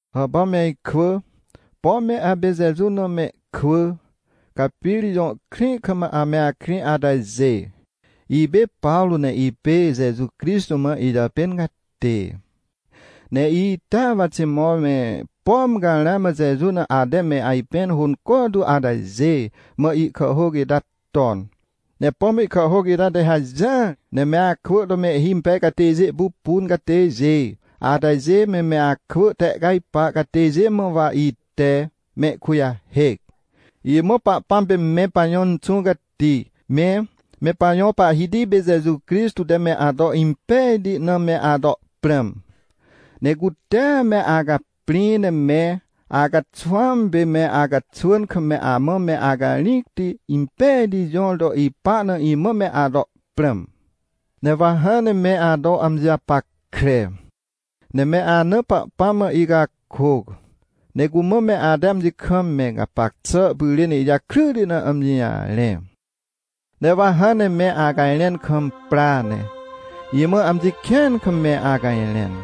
Hàpà me ikwỳ, pom me apê Jeju na mehkwỳ, ca Pirip jõ krĩ kam ame akrĩ atajê. Ipê Pawrô, ne ipê Jeju Crixtô mã ijàpên catê. Ne itea wa Timot me, pom ca ramã Jeju na ate me ajpẽn hônco tu atajê mã ihkàhhôc ita ton. Ne pom ihkàhhôc ita te hajỹar ne me akwỳ to mehhimpej catêjê pupun catêjê atajê me, me akwỳ tehcajpar catêjê mã, wa ite mehkujahêc. Imã Pahpãm pê me pajõ Inxũ Cati me, me pajõ Pahhiti pê Jeju Crixtô te me ato impejti na me ato prãm. Ne cute me acaprĩ, ne me acaxwãm pê me acaxwỳn kam, me amã me acarĩcti impejti jõr to ipa na, imã me ato prãm. Ne wa hãn ne me ato amji japackre, ne me ana Pahpãm mã icakôc, ne cumã me ate amji kam me gapac xà pyrên ijakryti na amji jarẽ. Ne wa hãn ne me acajrẽn kam pra, ne imã amji kĩan kam me acajrẽn.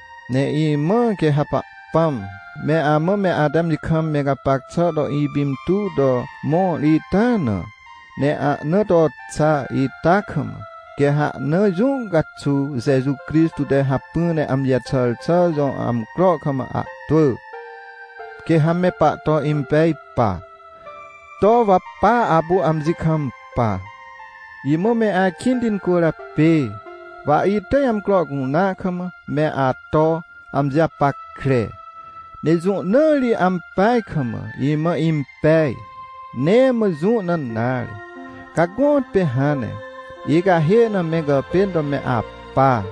Ne imãa, quê ha Pahpãm me amã me ate amji kam me gapac xà to ipintuw to mõr ita na, ne ahnaa to xa ita kam, quê ha ahnaa jũ caxuw Jeju Crixtô te hacpỹ ne amji jaxàr xà jõ amcro kam ahtwỳ, quê ha me pahto impej pa, to wa pa apu amji kampa. Imã me akĩnti incwỳrjapê, wa itỳj amcro cunea kam me ato amji japackre. Ne jũ na ri ampeaj kam imã impej? Nee mã jũ na nare. Ca gõtpê hãn ne icahê na me gàpên to me apa,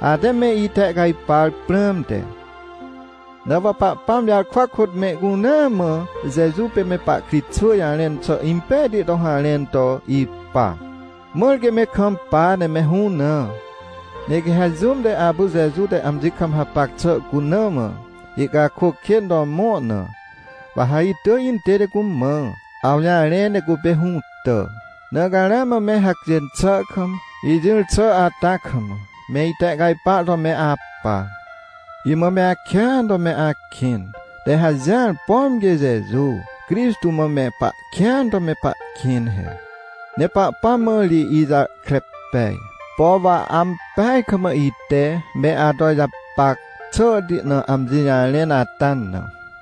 ate me itehcajpar prãmte. Na wa Pahpãm jarkwa kôt mehcunea mã Jeju pê me pahkritxwỳ jarẽn xà impejti to harẽn to ipa, mãr quê me kampa ne me hũnã. Ne quê ha jũm te apu Jeju te amji kam hapac xà cuna mã ihcakôc kên to mõr na, wa ha itỳj intête cumã awjarẽ ne cupê hũtà. Na ca ramã me hacjên xà kam, ijỹr xà ata kam, me itehcajpar to me apa. Imã me akĩan to me akĩn te hajỹar, pom quê Jeju Crixtô mã me pahkĩan to me pahkĩn he. Ne Pahpãm mã ri ijahkre pej, por wa ampeaj kam ite me ato ijapac xàhti na amji jarẽn ata na.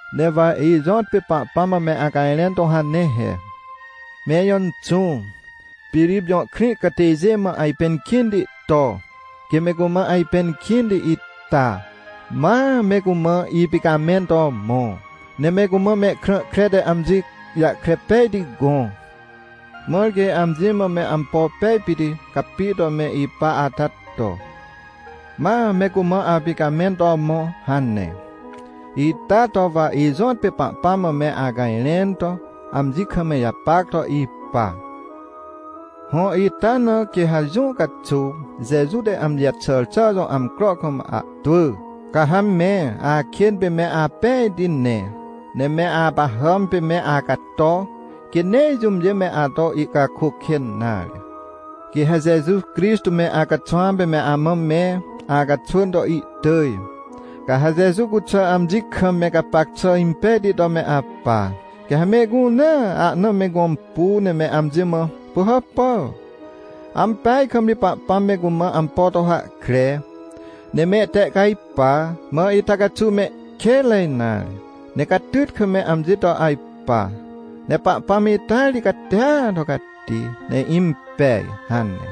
Ne wa ijõtpê Pahpãm mã me acajrẽn to hane he: — Me ijõ Inxũ, Pirip jõ krĩ catêjê mã ajpẽn kĩnti to, quê me cumã ajpẽn kĩnti ita, ma me cumã ipicamẽn to mõ. Ne me cumã mehkrã kre te amji jahkre pejti gõ, mãr quê amji mã me ampo pej pit capi to me ipa ata to, ma me cumã apicamẽn to mõ — hane. Ita to wa ijõtpê Pahpãm mã me acajrẽn to amji kam ijapac to ipa. Hõ, ita na quê ha jũ caxuw Jeju te amji jaxàr xà jõ amcro kam ahtwỳ, ca ha me akên pê me apejti ne, ne me apahàm pê me acato, quê nee jũmjê me ato ihcakôc kên nare. Quê ha Jeju Crixtô me acaxwãm pê me amã me acaxwỳn to ihtỳj. Ca ha Jeju cuxà amji kam me gapac xà impejti to me apa, quê ha mehcunea ahna me gõmpu, ne me amji mã: — Pỳhàpà! Ampeaj kam ri Pahpãm me cumã ampo to hahkre, ne mehtehcajpa, mã ita caxuw mehkênre nare, ne catyt kam me amji to ajpa. Ne Pahpãm ita ri catia to cati ne impej — hane.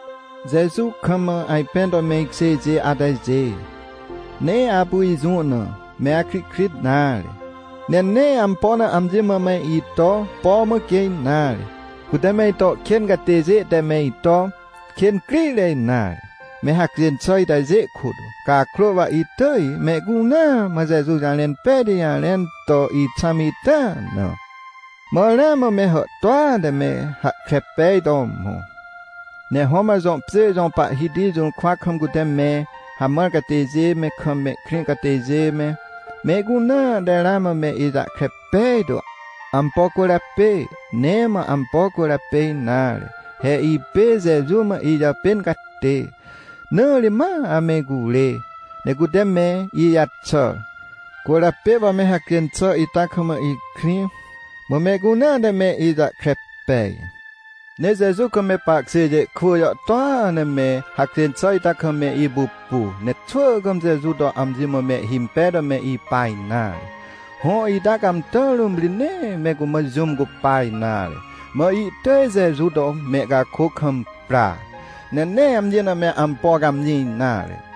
Jeju kam ajpẽn to me ikjêjê atajê, nee apu ijũ na me akrihkrit nare, ne nee ampo na amji mã me ito põ mã quê nare. Cute me ito kên catêjê te me ito kên crire nare, me hacjên xà itajê kôt. Cakrô wa itỳj mehcunea mã Jeju jarẽn pejti jarẽn to ixãm ita na. Mã ramã me hàhtôa te me hahkre pej to mõ. Ne Roman jõ pjê jõ pahhiti jũrkwa kam cute me hamãr catêjê me, kam mehkrĩ catêjê me, mehcunea te ramã me ijahkre pejtu. Ampo cwỳrjapê? Nee mã ampo cwỳrjapê nare. He ipê Jeju mã ijàpên catê, na ri ma ame icurê, ne cute me ijaxàr, cwỳrjapê wa me hacjên xà ita kam ikrĩ, mã mehcunea te me ijahkre pej. Ne Jeju kam me pahkjêjê kwỳ jàhtôa ne me hacjên xà ita kam me ipupu, ne xwỳ kam Jeju to amji mã mehhimpej to me ipa nare. Hõ, ita cãmtà rũm ri nee me cumã jũm cupa nare, mã ihtỳj Jeju to mehcakôc kam pra, ne nee amji na me ampo cãmjĩ nare.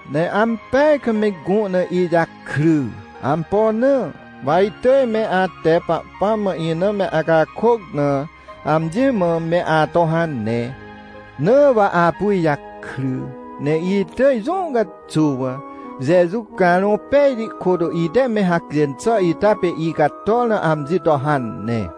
Ne ampeaj kam me gũ na ijakry. Ampo na? Wa itỳj me ate Pahpãm mã ina me acakôc na, amji mã me ato hane. Na wa apu ijakry, ne itỳj jũ caxuw, Jeju Carõ Pejti kôt, ite me hacjên xà ita pê icator na, amji to hane.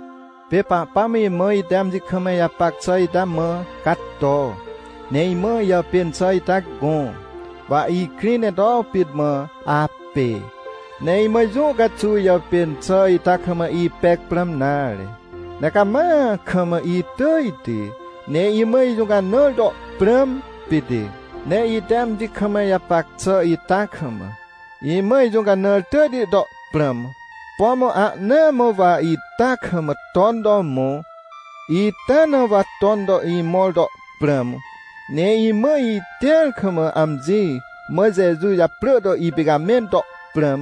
Pê Pahpãm imã, ite amji kam ijapac xà ita mã cato, ne imã ijàpên xà ita gõ, wa ikrĩ ne to pit mã apê. Ne imã jũ caxuw ijàpên xà ita kam ipec prãm nare, ne cama kam itỳjti, ne imã ijũcanãr to prãm pit. Ne ite amji kam ijapac xà ita kam, imã ijũcanãr tỳjti to prãm, pom ahnaa mã wa ita kam ton to mõ, ita na wa ton to imõr to prãm. Ne imã itĩar kam, amji mã Jeju japrỳ to ipicamẽn to prãm,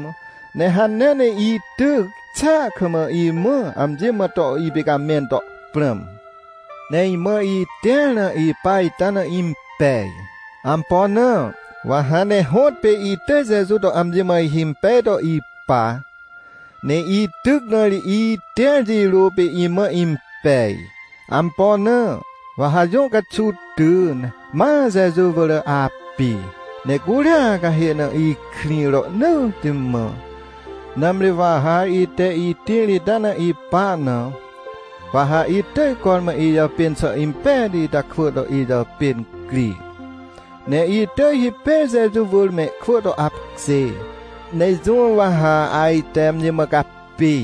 ne hanea ne ityc xàa kam, imã amji mã to ipicamẽn to prãm. Ne imãa itĩar na ipa ita na impej. Ampo na? Wa hãn ne hõtpê itỳj Jeju to amji mã ihimpej to ipa. Ne ityc na ri itĩr jirôa pê imã impej. Ampo na? Wa ha jũ caxuw ty, ne ma Jeju wỳr api, ne curia cahê na ikrĩ rohnỳtti mã. Nãmri wa ha ite itĩr ita na ipa na, wa ha itỳj cormã ijàpên xà impejti ita kwỳ to ijàpên cri. Ne itỳj hipêr Jeju wỳr mehkwỳ to apkjê. Ne jũ wa ha ajte amji mã capi?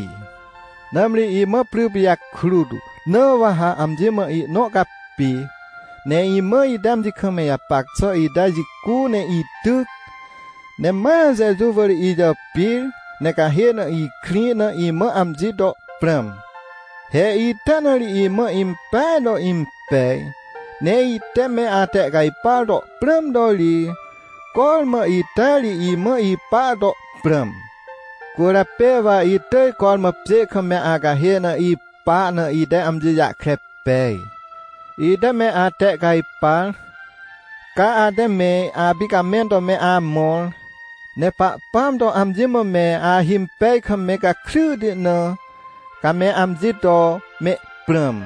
Nãmri imã pry pijakrut na wa ha amji mã ihnõ capi. Ne imã, ite amji kam ijapac xà ita jicu ne ityc, ne ma Jeju wỳr ijàpir, ne cahê na ikrĩ na, imã amji to prãm. He ita na ri imã impeaj to impej. Ne ite me atehcajpar to prãm to ri, cormã ita ri imã ipa to prãm. Cwỳrjapê wa itỳj cormã pjê kam me acahê na ipa na ite amji jahkre pej. Ite me atehcajpar, ca ate me apicamẽn to me amõr, ne Pahpãm to amji mã me ahimpej kam me gakryti na, ca me amji to mehprãm.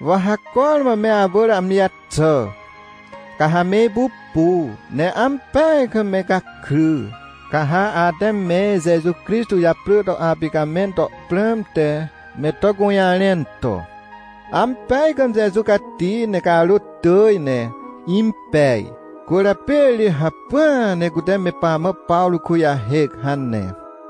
Wa ha cormã me awỳr amji jaxà, ca ha me ipupu, ne ampeaj kam me gakry. Ca ha ate me Jeju Crixtô japrỳ to apicamẽn to prãmte me to gũjarẽn to: — Ampeaj kam Jeju cati ne carôt tỳj ne impej, cwỳrjapê ri hacpỹa ne cute me pamã Pawrô kujahêc — hane.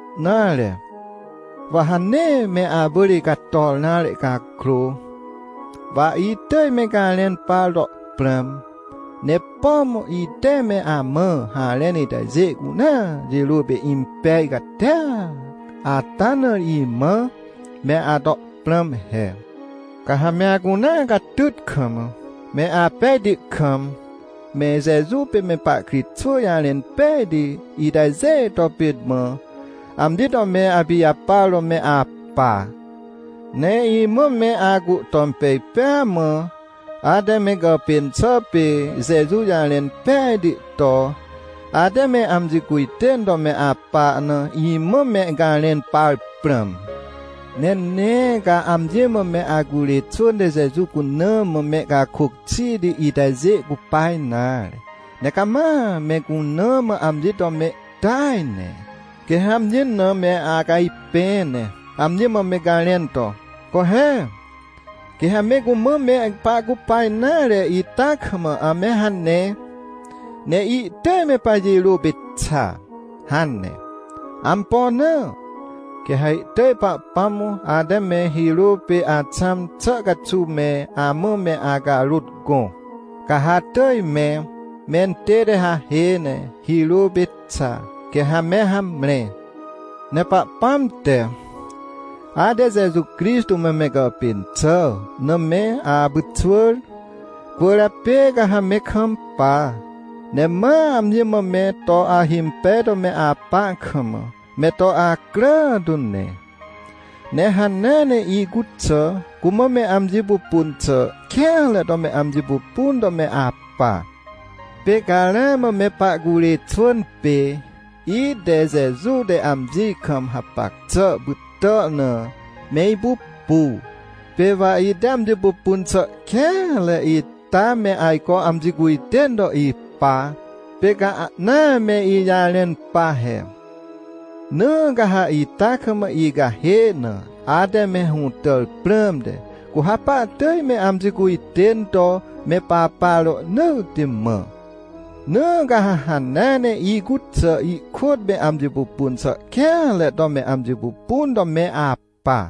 Nare, wa ha nee me awỳr icator nare cakrô, wa itỳj me garẽn par to prãm. Ne pom ite me amã harẽn itajê cunea jirôa pê impej catia ata na ri, imã me ato prãm he. Ca ha me acunea catyt kam, me apejti kam, me Jeju pê me pahkritxwỳ jarẽn pejti itajê to pit mã, amji to me apijapar to me apa. Ne imã me acuhtom pej pêa mã, ate me gàpên xà pê Jeju jarẽn pejti to, ate me amji cujtên to me apa na imã me garẽn par prãm. Ne nee ca amji mã me acurê xwỳn te Jeju cuna mã mehcakôc xiti itajê cupa nare, ne cama me cuna mã amji to mehtỳaj ne. Quê ha amji na me acajpẽ, ne amji mã me garẽn to: — Co he! Quê ha me cumã me pahcupa nare ita kam ame hane, ne ihtỳj me pajirô pê xa — hane. Ampo na? Quê ha ihtỳj Pahpãm ate me hirô pê axãm xà caxuw me amã me acarôt gõ, ca ha atỳj me mentête hahê ne hirô pê xa, quê ha me hamre. Ne Pahpãm te, ate Jeju Crixtô mã me gàpên xà na, me apyxwỳr. Cwỳrjapê ca ha me kampa, ne ma amji mã me to ahimpej to me apa kam, me to acrà tu ne. Ne hanea ne icuxà cumã me amji pupun xà kêanre to me amji pupun to me apa. Pê ca ramã me pahcurê xwỳn pê, ite Jeju te amji kam hapac xà pytàr na, me ipupu. Pê wa ite amji pupun xà kêanre ita me ajco amji cujtên to ipa, pê ca ahna me ijarẽn pa he. Na ca ha ita kam icahê na ate me hũtàr prãmte, cu ha pahtỳj me amji cujtên to me papa rohnỳtti mã. Na ca ha hanea ne, icuxà ikôt me amji pupun xà kêanre to me amji pupun to me apa.